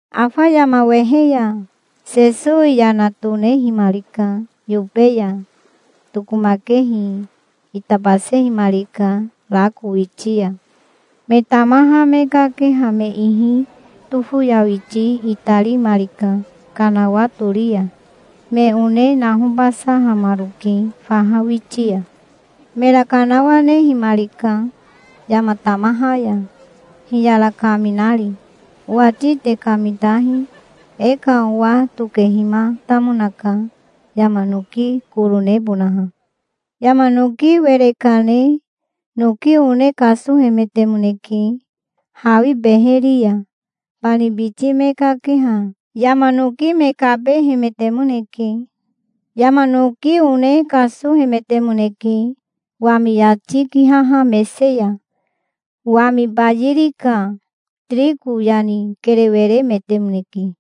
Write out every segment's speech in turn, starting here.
Afa yama wehe ya, Sesowi yana tonehimarika yobe ya. Tokomakehi itabasehimarika rako witi ya. Me tamaha me kakeha me ihi tofoyawiti itarimarika kanawa tori ya. Me one nahobasahamaroke faha witi ya. Mera kanawanehimarika yama tamaha ya, hiyara kaminari. "Owati te kamitahi. E ka owa tokehimatamonaka yama noki koro nebonaha. Yama noki were kane noki one kasohemetemoneke hawi beheri ya. Bani biti me kakeha yama noki me kabehemetemoneke. Yama noki one kasohemetemoneke wami yati kihaha mese ya. Wami bayiri ka tiriko yani kerewe remetemoneke.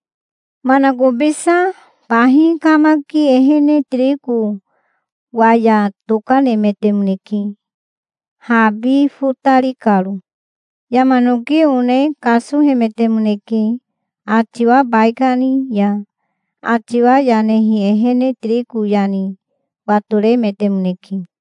Manakobisa bahi kamaki ehene tiriko waya tokanemetemoneke, habi fotari karo. Yama noki one kasohemetemoneke atiwa baikani ya. Atiwa yanehi ehene tiriko yani watoremetemoneke.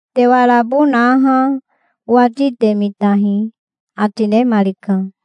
Te warabo naha owati te mitahi", ati nemarika.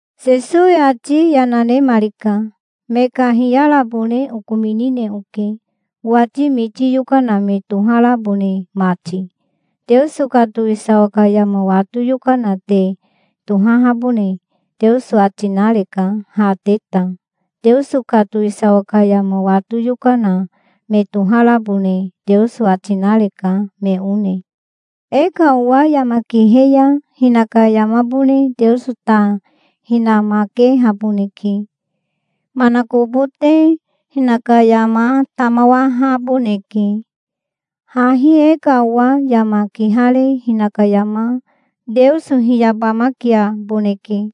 Sesowi ati yana nemarika. "Me ka hiyarabone okominine oke, owati miti yokana me toharabone mati. Teoso ka towisawa ka yama wato yokana te tohahabone Teoso ati nareka, ha te ta. Teoso ka towisawa ka yama wato yokana me toharabone Teoso ati nareka, me one. E ka owa yama kihe ya hinaka yamabone Teoso ta hinamakehaboneke. Manakobote hinaka yama tamawahaboneke. Hahi e ka owa yama kihare hinaka yama Teoso hiyabamakiaboneke.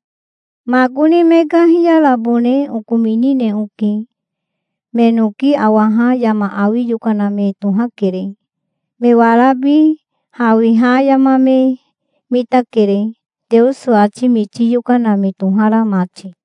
Makoni me ka hiyarabone okominine oke. Me noki awaha yama awi yokana me tohakere. Me warabi hawiha yama me mitakere, Teoso ati miti yokana me tohara mati.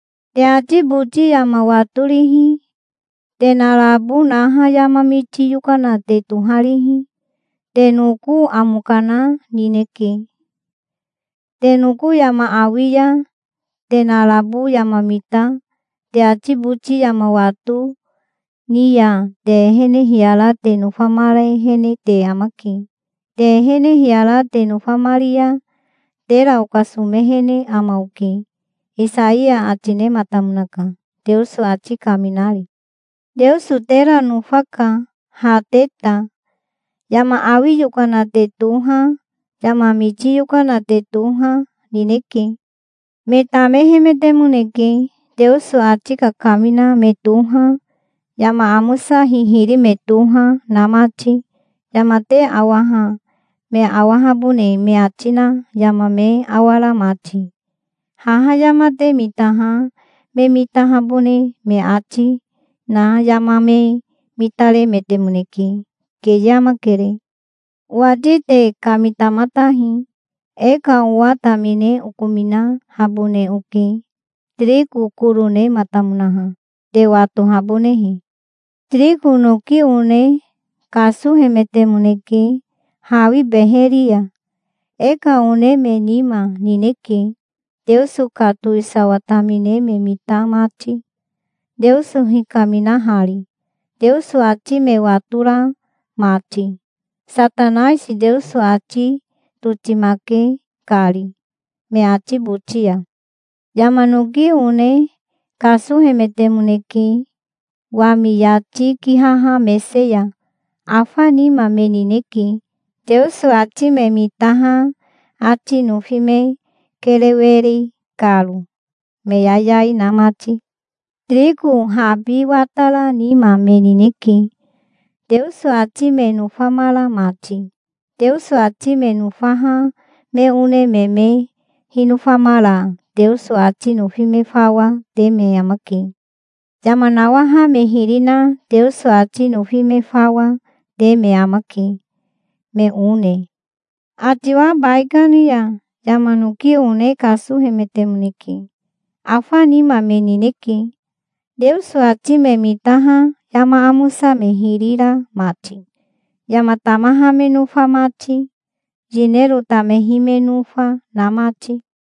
Te ati boti yama watorihi, te narabo naha yama miti yokana te toharihi, te noko amo kana nineke. Te noko yama awi ya te narabo yama mita, te ati boti yama wato ni ya te ehene hiyara te nofamarehene te amake. Te ehene hiyara te nofamari ya tera okasomehene ama oke', Isaiya ati nematamonaka, Teoso ati kaminari. Teoso tera nofaka, ha te ta. Yama awi yokana te toha, yama miti yokana te toha, nineke. Me tamehemetemoneke, Teoso ati kakamina me toha, yama amosa hihiri me toha, na mati, yama te awaha me awahabone me ati na yama me awara mati. Haha yama te mitaha me mitahabone me ati na yama me mitaremetemoneke. Keye amakere". "Owati te kamitamatahi. E ka owa tamine okominahabone oke, tiriko koro nematamonaha, te watohabonehe. Tiriko noki one kasohemetemoneke hawi beheri ya. E ka one me nima nineke, Teoso ka towisawa tamine me mita mati, Teoso hikaminahari, Teoso ati me watora mati, Satanaisi Teoso ati totimake kari me ati boti ya. Yama noki one kasohemetemoneke wami yati kihaha mese ya. Afa nima me nineke, Teoso ati me mitaha ati nofi me kerewe ri karo, me yayai na mati. Tiriko habi watara nima me nineke, Teoso ati me nofamara mati. Teoso ati me nofaha me one me me hinofamara Teoso ati nofi me fawa te me amake. Yama nawaha me hiri na Teoso ati nofi me fawa, te me amake, me one. Atiwa baikani ya yama noki one kasohemetemoneke. Afa nima me nineke, Teoso ati me mitaha yama amosa me hiri ra mati, yama tamaha me nofa mati, yinero tamehi me nofa, na mati.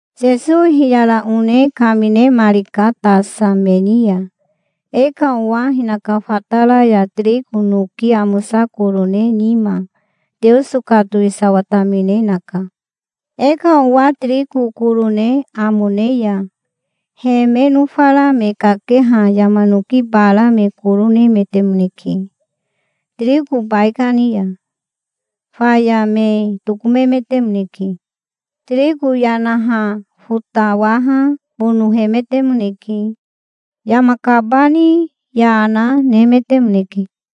Sesowi hiyara one kaminemarika tasa me ni ya. "E ka owa hinaka fatara ya tiriko noki amosa koro ne nima Teoso ka towisawa tamine naka. E ka owa tiriko koro ne amo ne ya he me nofara me kakeha yama noki bara me koro nemetemoneke, tiriko baikani ya. Faya me tokomemetemoneke. Tiriko yanaha fotawaha bonohemetemoneke. Yama kabani yana, nemetemoneke".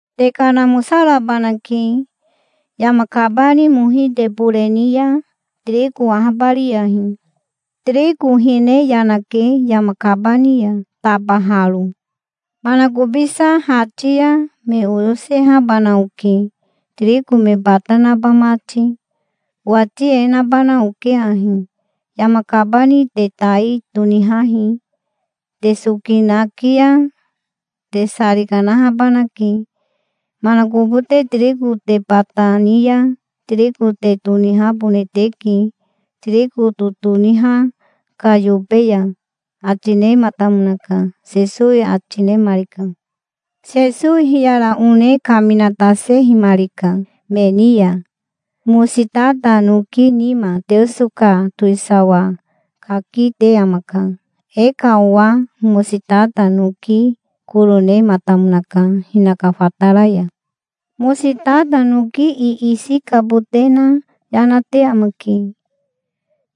"'Te kanamosarabanake. Yama kabani mohi te bore ni ya tiriko ahabariyahi. Tiriko hine yanake yama kabani ya tabaharo. Manakobisa hati ya me oyosehabana oke, tiriko me bata naba mati. Owati e nabana oke ahi: Yama kabani te tai tonihahi. Te soki naki ya te sari kanahabanake. Manakobote tiriko te bata ni ya tiriko te tonihabone teke tiriko totoniha ka yobe ya', ati nematamonaka", Sesowi ati nemarika. Sesowi hiyara one kaminatasehimarika me ni ya. "Mositata noki nima Teoso ka towisawa kaki te amaka. E ka owa mositata noki koro nematamonaka hinaka fatara ya. Mositata noki iisi kabote na yanate amake.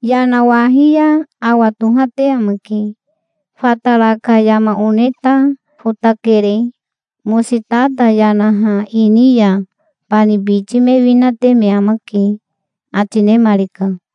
Yanawahi ya awa tohate amake. Fatara ka yama one ta fotakere. Mositata yanaha ini ya bani biti me winate me amake", ati nemarika.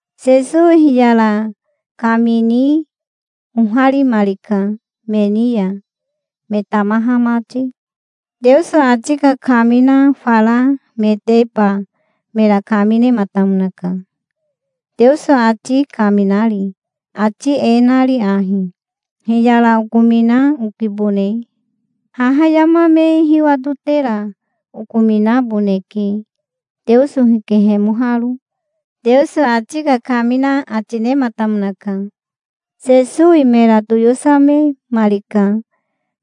Sesowi hiyara kamini oharimarika me ni ya, me tamaha mati. Teoso ati kakamina fara meteba mera kaminematamonaka, Teoso ati kaminari, ati e nari ahi: "Hiyara okomina okibone. Haha yama me hiwatotera okominaboneke, Teoso hikehemoharo", Teoso ati kakamina ati nematamonaka. Sesowi mera toyosememarika,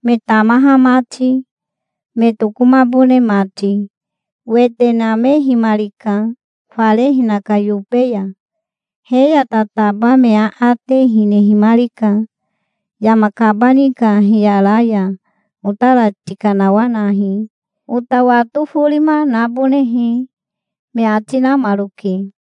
me tamaha mati, me tokomabone mati. Wete namehimarika fare hinaka yobe ya. He ya tataba me aate hinehimarika. "Yama kabani ka hiyara ya otara tikanawanahi, ota wato forima nabonehe", me ati namaroke.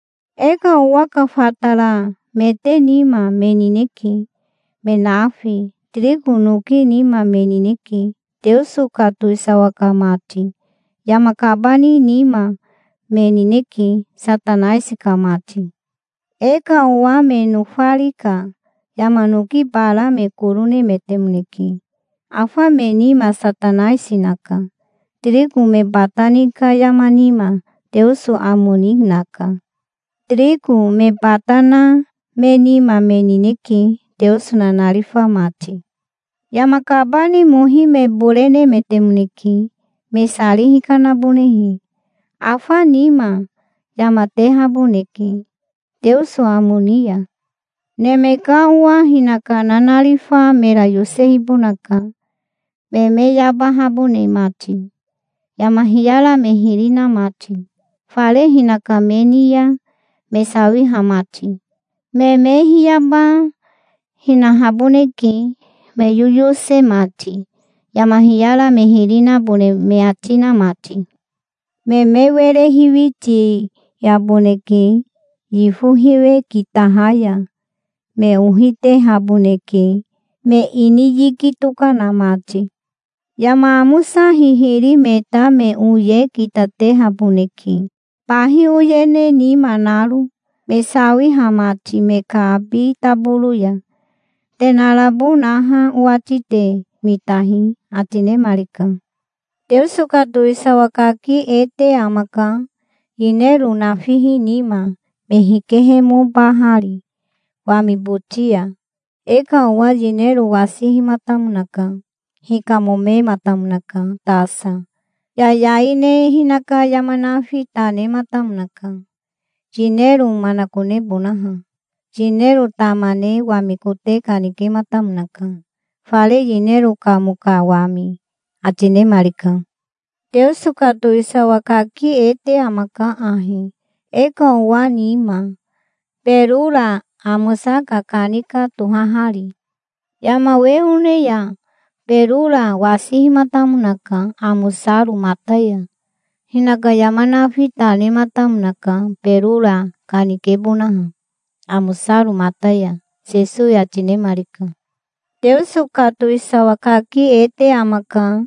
E ka owa ka fataramete nima, me nineke, me nafi. Tiriko noki nima me nineke, Teoso ka towisawa ka mati. Yama kabani nima me nineke, Satanaisi ka mati. E ka owa me nofari ka yama noki bara me koro nemetemoneke. Afa me nima Satanaisi naka. Tiriko me bata ni ka yama nima Teoso amo ni naka. Tiriko me bata na me nima me nineke, Teoso nanarifa mati. Yama kabani mohi me bore nemetemoneke, me sari hikanabonehe. Afa nima, yama tehaboneke Teoso amo ni ya. Neme ka Owa hinaka nanarifa mera yosehibonaka, me me yabahabone mati, yama hiyara me hiri na mati, fare hinaka me ni ya me sawiha mati. Me me hiyaba hinahaboneke, me yoyose mati, yama hiyara me hiri nabone me ati na mati. Me me were hiwitiaboneke yifo hiwe kitaha ya. Me ohi tehaboneke, me ini yiki tokana mati. Yama amosa hihiri me ta me oye kitatehaboneke, bahi oyene nima naro, me sawiha mati me ka abi taboro ya. Te narabo naha owati te mitahi", ati nemarika. "Teoso ka towisawa kaki e te amaka, yinero nafihi nima, me hikehemobahari wami boti ya. E ka owa yinero wasihimatamonaka. Hikamomematamonaka tasa. Yayai ne hinaka yama nafi ta nematamonaka, yinero manakonebonaha. Yinero tama ne wami kote kanikematamonaka, fare yinero kamo ka wami", ati nemarika. "Teoso ka towisawa kaki e te amaka ahi, e ka owa nima, berora amosa kakanika tohahari. Yama we one ya berora wasihimatamonaka amosaro mata ya. Hinaka yama nafi ta nematamonaka berora kanikebonaha, amosaro mata ya", Sesowi ati nemarika. "Teoso ka towisawa kaki e te amaka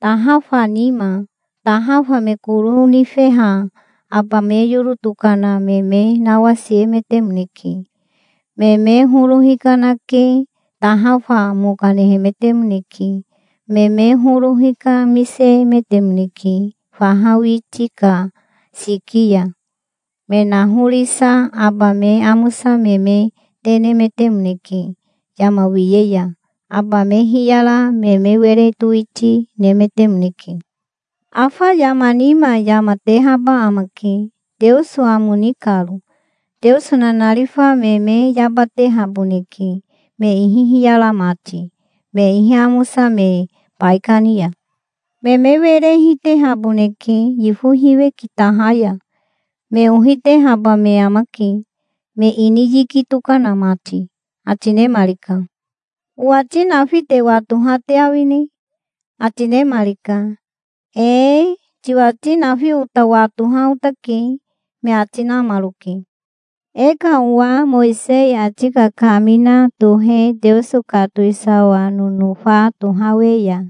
tahafa nima. Tahafa me koro nifeha aba me yoro tokana me me nawasiemetemoneke. Me me horo hikanake tahafa mo kanehemetemoneke. Me me horo hikamisehemetemoneke faha witi ka siki ya. Me nahorisa aba me amosa me me te nemetemoneke yama wiye ya. Aba me hiyara me me were towiti nemetemoneke. Afa yama nima yama tehaba amake, Teoso amo ni karo. Teoso nanarifa me me yabatehaboneke, me ihi hiyara mati, me ihi amosa me baikani ya. Me me were hitehaboneke yifo hiwe kitaha ya. Me ohi tehaba me amake, me ini yiki tokana mati", ati nemarika. "Owati nafi te watoha te awine?" ati nemarika. "Ee, tiwati nafi ota watoha otake", me ati namaroke. "E ka owa Mowisei ati kakamina tohe Teoso ka towisawa nonofa tohawe ya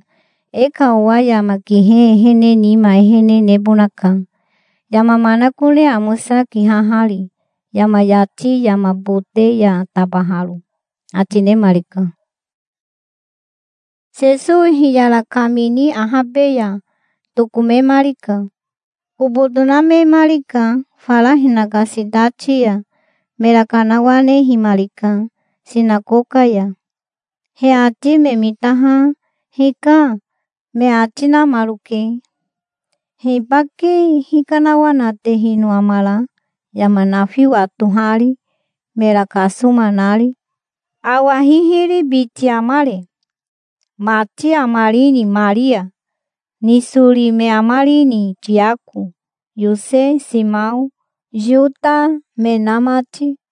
e ka owa yama kihe ehene nima ehene nebonaka, yama manakone amosa kihahari, yama yati yama bote ya tabaharo", ati nemarika. Sesowi hiyara kamini ahabe ya tokomemarika. Kobo tonamemarika fara hinaka sitati ya. Mera kanawanehimarika sinakoka ya. He ati me mitaha "Hika", me ati namaroke. "Hibake hikanawanatehino amara, yama nafi watohari, mera kasoma nari? Awa hihiri biti amare? Mati amarini, Maria? Nisori me amarini, Tiako, Yose, Simao, Yota me na mati?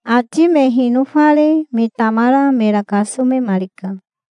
Ati me hinofare me tamara mera kasomemarika.